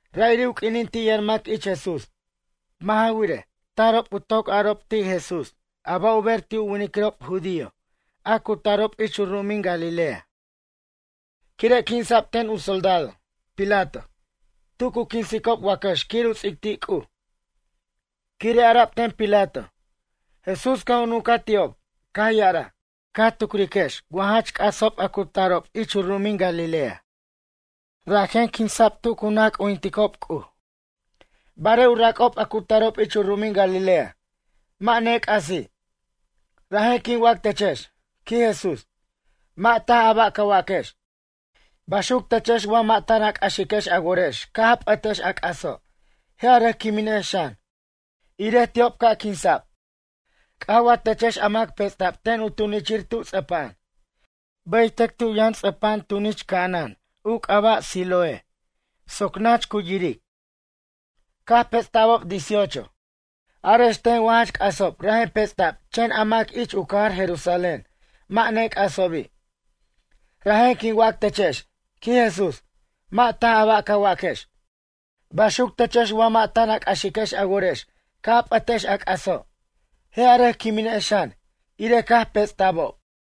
Ra'iri' u q'uinin ti' yʌn mac ich Jesús. Mʌ' ja wirej, tarob u toc arob ti' Jesús a ba' u ber ti' u winiquirob judío a cu tarob ich u ru'umin Galilea. Quire' quinsa'b ten u soldado, Pilato, tu cu quinsicob wacʌx quir u ts'ic ti' C'uj. Quire' ara'b ten Pilato. Jesús caj u nuncaj ti'ob, caj ya'araj: ―Ca tucriquex wa jach c'asob a cu tarob ich u ru'umin Galilea? Rajen quinsa'b tu cu naj c'ujinticob C'uj. Barej u rac'ob a cu tarob ich u ru'umin Galilea mʌ' nec'asi'. Rajen quin wac techex ―quij Jesús―, mʌ' taj a ba' ca waquex. Baxuc techex wa mʌ' tan a c'axiquex a worex caj a p'ʌtex a c'aso' je' a rʌc quiminex xan, irej ti'ob ca' quinsa'b. C'aj wa techex a mac pets'ta'b ten u tunichir tu ts'ʌpa'an? Bʌytʌc tu yʌn u ts'ʌpa'an tunich ca'anan u c'aba' Siloé soc nach cu yiric. Caj pets'ta'bob dieciocho. Arex ten wa jach c'asob rajen pets'ta'b chen a mac ich u cajar Jerusalén mʌ' nec'asobi'? Rajen quin wac techex ―quij Jesús―, mʌ' taj a ba' ca waquex. Baxuc techex wa mʌ' tan a c'axiquex a worex ca' a p'ʌtex a c'aso'. Je' a rʌc quiminex xan, irej caj pets'abob.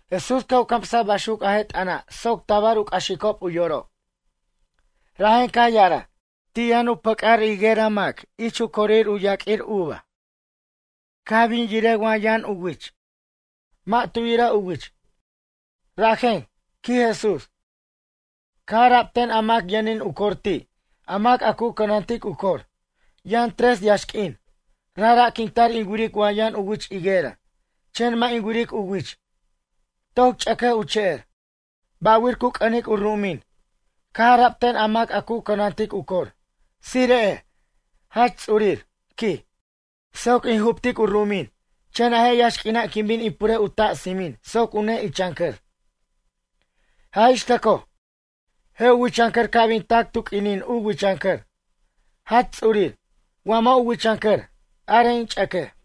Jesús caj u camsaj baxuc a je' t'ʌna' soc tabar u c'axicob u yorob. Rajen caj ya'araj: ―Ti' yʌn u pʌc'ar higuera ich corir u yaq'uir uva mac. Caj bin yiric wa yʌn u wich. Mʌ' tu yira u wich. Rajen ―quij Jesús―, caj ara'b ten a mac yʌnin u cor ti' a mac a cu cʌnantic u cor: “Yʌn tres yaxq'uin, rajra' quin tar in wiric wa yʌn u wich higuera. Chen mʌ' in wiric u wich. Toc ch'ʌquej u che'er, ba'wir cu c'ʌnic u ru'umin?” Caj ara'b ten a mac a cu cʌnantic u cor: “Tsire'ej, Jach Ts'urir ―quij―, soc in juptic u ru'umin chen a je' yaxq'uina' quin bin in purej u ta' tsimin soc u ne'ichancʌr. Jaj ixtʌcoj, je' u wichancʌr ca' bin tac tu q'uinin u wichʌncʌr. Jach Ts'urir, wa mʌ' u wichancʌr, arej in ch'ʌquej.”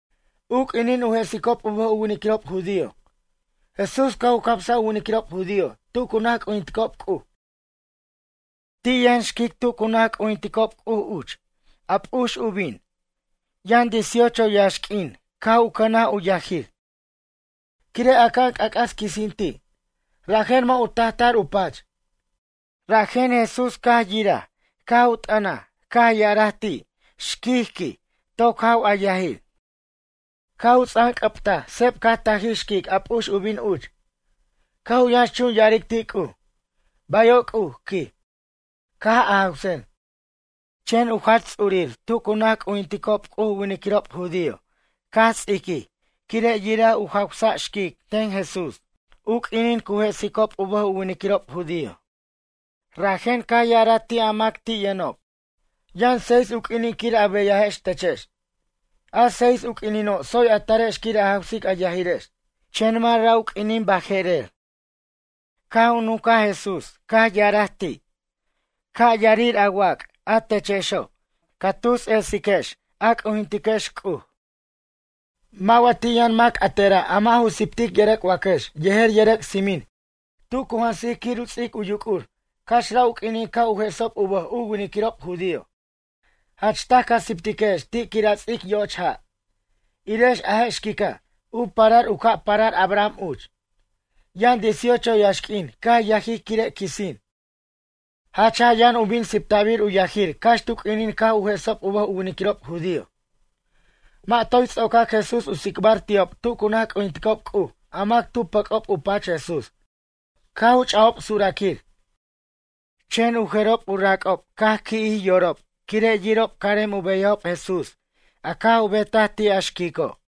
U q'uinin u jesicob u bʌj u winiquirob judío, Jesús caj u camsaj u winiquirob judío tu cu naj c'ujinticob C'uj. Ti' yʌn tu cu naj c'ujinticob C'uj uch xquic, a p'ux u bin, yʌn dieciocho yaxq'uin caj u cʌnaj u yajir. Quire' aca'an c'ac'as quisin ti', rajen mʌ' u tajtar u pach. Rajen Jesús caj yiraj caj u t'ʌna caj ya'araj ti': ―Xquic ―quen―, toc jaw a yajir. Caj u ts'anc'ʌbtaj seb caj tajij xquic a p'ux u bin cuch. Caj u yʌnxchun ya'aric ti' C'uj: ―Bayo' C'uj ―quij―, caj a jawsajen. Chen u jach ts'urir tu cu naj c'ujinticob C'uj u winiquirob judío caj ts'iquij quire' yiraj u jawsic Jesús xquic u q'uinin cu jesicob u bʌj u winiquirob judío. Rajen caj ya'araj ti' a mac ti' yʌnob. Yʌn seis u q'uinin quir a beyajex techex. A seis u q'uinino' tsoy a tarex quir a jawsic a yajirex, chen mʌ' ra' u q'uinin baje'ra'. Caj u nuncaj Jesús caj ya'araj ti': ―Ca' yarir a wac' a techexo' ca tus ets'iquex a c'ujintiquex C'uj. Mʌ' wa ti' yʌn mac a tera' a mʌ' ju siptic yʌrʌc' wacʌx yejer yʌrʌc' tsimin tu cu jansic quir u ts'ic u yuc'ur cax ra' u q'uinin caj u jesob u bʌj u winiquirob judío? Jach taj ca siptiquex ti' quir a ts'ic yo'och ja'. Irex a je' xquica', u parar u ca' parar Abraham uch. Yʌn dieciocho yaxq'uin caj yajij quire' quisin. Jach jaj yʌn u bin sipta'bir u yajirir cax tu q'uinin caj u jesob u bʌj u winiquirob judío. Mʌ' toy ts'ocac Jesús u tsicbar ti'ob tu cu naj c'ujinticob C'uj a mac tu pʌc'ob u pach Jesús caj u ch'ajob suraquir. Chen u jerob u rac'ob caj qui'jij yorob quire' yirob carem u beyajob Jesús a caj u betaj ti' a xquico'.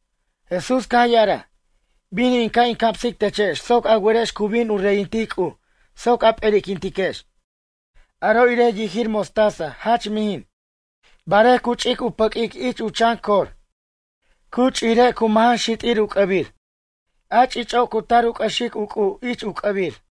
Jesús caj ya'araj: ―Bin in ca' in camsic techex soc a werex cu bin u reyintic C'uj soc a p'erquintiquex. Aro' irej u yijir mostaza jach mijin. Barej cu ch'ic u pʌq'uic ich u chan cor. Cu ch'ijire' cu majan xit'ir u c'ʌbir. A ch'ich'o' cu tar u c'ʌxic u c'u' ich u c'ʌbir.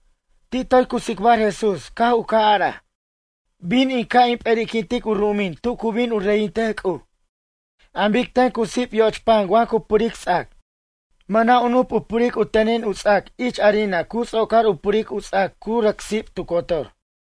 Ti' toy cu tsicbar Jesús caj u ca' a'araj: ―Bin in ca' in p'eri'quintic u ru'umin tu cu bin u reyintej C'uj. An bic ten cu sip' yoch pan wa cu puric ts'ac. Mʌna' u nup u puric u tenin u ts'ac ich harina cu ts'ocar u puric u ts'ac cu rʌc sip' tu cotor.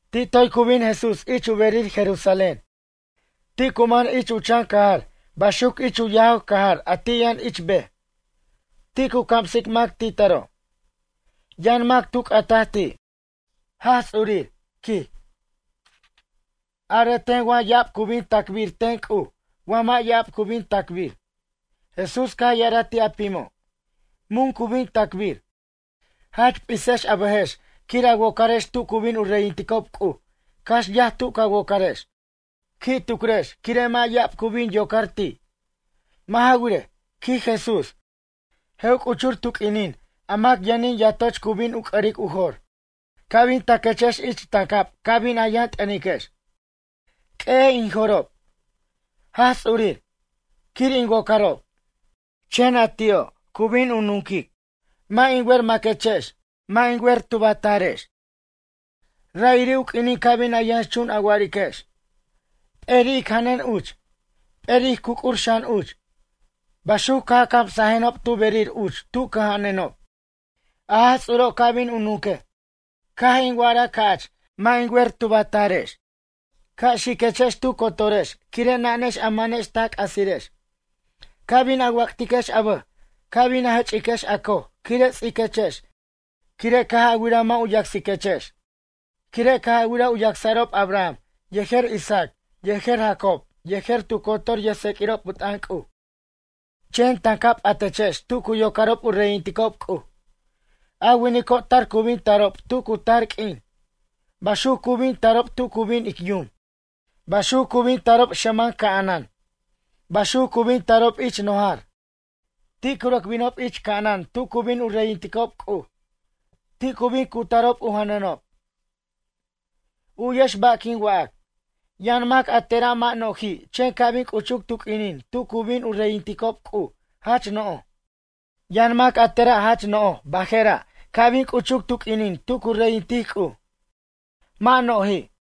Ti' toy cu bin Jesús ich u berir Jerusalén. Ti' cu man ich u chan cajar baxuc ich u yajaw cajar a ti' yʌn ich bej. Ti' cu camsic mac ti taro'. Yʌn mac tu c'ataj ti': ―Jaj Ts'urir ―quij―, arej ten wa ya'ab cu bin tacbir ten C'uj wa mʌ' ya'ab cu bin tacbir? Jesús caj ya'araj ti' a pimo': ―Mun cu bin tacbir? Jach p'isex a bʌjex quir a wocarex tu cu bin u reyinticob C'uj cax yaj tu ca wocarex. Qui' tucriquex quire' mʌ' ya'ab cu bin yocar ti'. Mʌ' ja wirej ―quij Jesús―, je' u c'uchur tu q'uinin a mac yʌnin yatoch cu bin u c'ʌric u jor. Ca' bin taquechex ich tancab ca' bin a yʌn t'ʌniquex: “Q'ueyej in jo'rob, Jaj Ts'urir, quir in wocarob.” Chen a ti'o' cu bin u nunquic: “Mʌ' in wer maquechex, mʌ' in wer tub a tarex.” Ra'iri' u q'uinin ca bin a yʌnxchun a wa'ariquex: “P'eri' ic janʌn uch, p'eri' ij cuc'ur xan uch. Baxuc caj a camsajenob tu berir uch tu cʌja'anenob.” A Jaj Ts'uro' ca' bin u nunquej: “Caj in wa'araj ca'ch mʌ' in wer tub a tarex. Ca' xiquechex tu cotorex quire' nanex a manex ta c'asirex.” Ca' bin a wac'tiquex a bʌj ca' bin a jʌch'iquex a coj quire' ts'iquechex quire' caj a wiraj mʌ' u yacsiquechex. Quire' caj a wiraj u yacsa'rob Abraham yejer Isaac yejer Jacob yejer tu cotor yʌjtseq'uirob u t'ʌn C'uj. Chen tancab p'atechex tu cu yocarob u reyinticob C'uj. A winico' tar cu bin tarob tu cu tar q'uin. Baxuc cu bin tarob tu cu bin ic yum. Baxuc cu bin tarob xʌman ca'anan. Baxuc cu bin tarob ich nojar. Ti' cu rʌc binob ich ca'anan tu cu bin u reyinticob C'uj. Ti' cu bin cutarob u janʌnob. U'yex ba' quin wac, yʌn mac a tera' mʌ' no'ji' chen ca' bin c'uchuc tu q'uinin tu cu bin u reyinticob C'uj jach no'j. Yʌn mac a tera' jach no'j baje'ra' ca' bin c'uchuc tu q'uinin tu cu reyintic C'uj. Mʌ' no'ji'.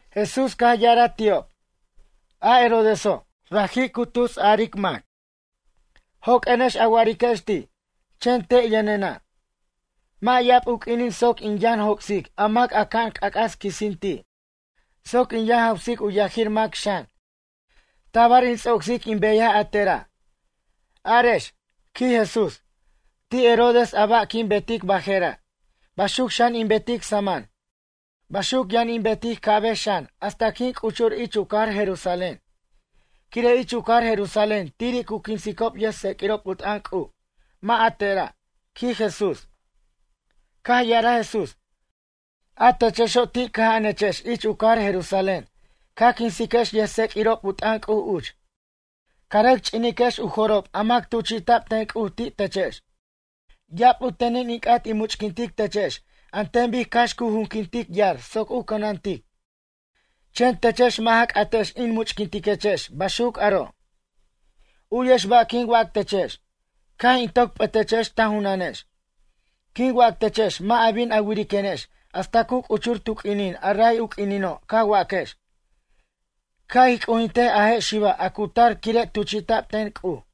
Jesús caj ya'araj ti'ob: ―A Herodeso', raji' cu tusaric mac. Joq'uenex a wa'ariquex ti': “Chen te' yʌnena', mʌ' ya'ab u q'uinin soc in yʌn joc'sic a mac aca'an c'ac'as quisin ti'. Soc in yʌn jawsic u yajir mac xan. Tabar in ts'ocsic in beyaj a tera'.” Arex ―quij Jesús―, ti' Herodes a ba' quin betic baje'ra'. Baxuc xan in betic saman. Baxuc yʌn in betic ca'bej xan hasta quin c'uchur ich u cajar Jerusalén. Quire' ich u cajar Jerusalén tiri' cu quinsicob yʌjtseq'uirob u t'ʌn C'uj, mʌ' a tera' ―quij Jesús. Caj ya'araj Jesús: ―A techexo' ti' cʌja'anechex ich u cajar Jerusalén. Ca quinsiquex yʌjtseq'uirob u t'ʌn C'uj uch. Ca rʌc ch'iniquex u jo'rob a mac tuchi'ta'b ten C'uj ti' techex. Ya'ab u tenin in c'at in much'quintic techex an ten bic cax cu juquintic yar soc u cʌnantic. Chen techex mʌ' ja c'atex in much'quintiquechex baxuc aro'. U'yex ba' quin wac techex. Caj in toc p'ʌtechex ta junanex. Quin wac techex mʌ' a bin a wiriquenex hasta cu c'uchur tu q'uinin a ray u q'uinino' ca waquex: “Ca' ij c'ujintej a je' xiba' a cu tar quire' tuchi'ta'b ten C'uj.”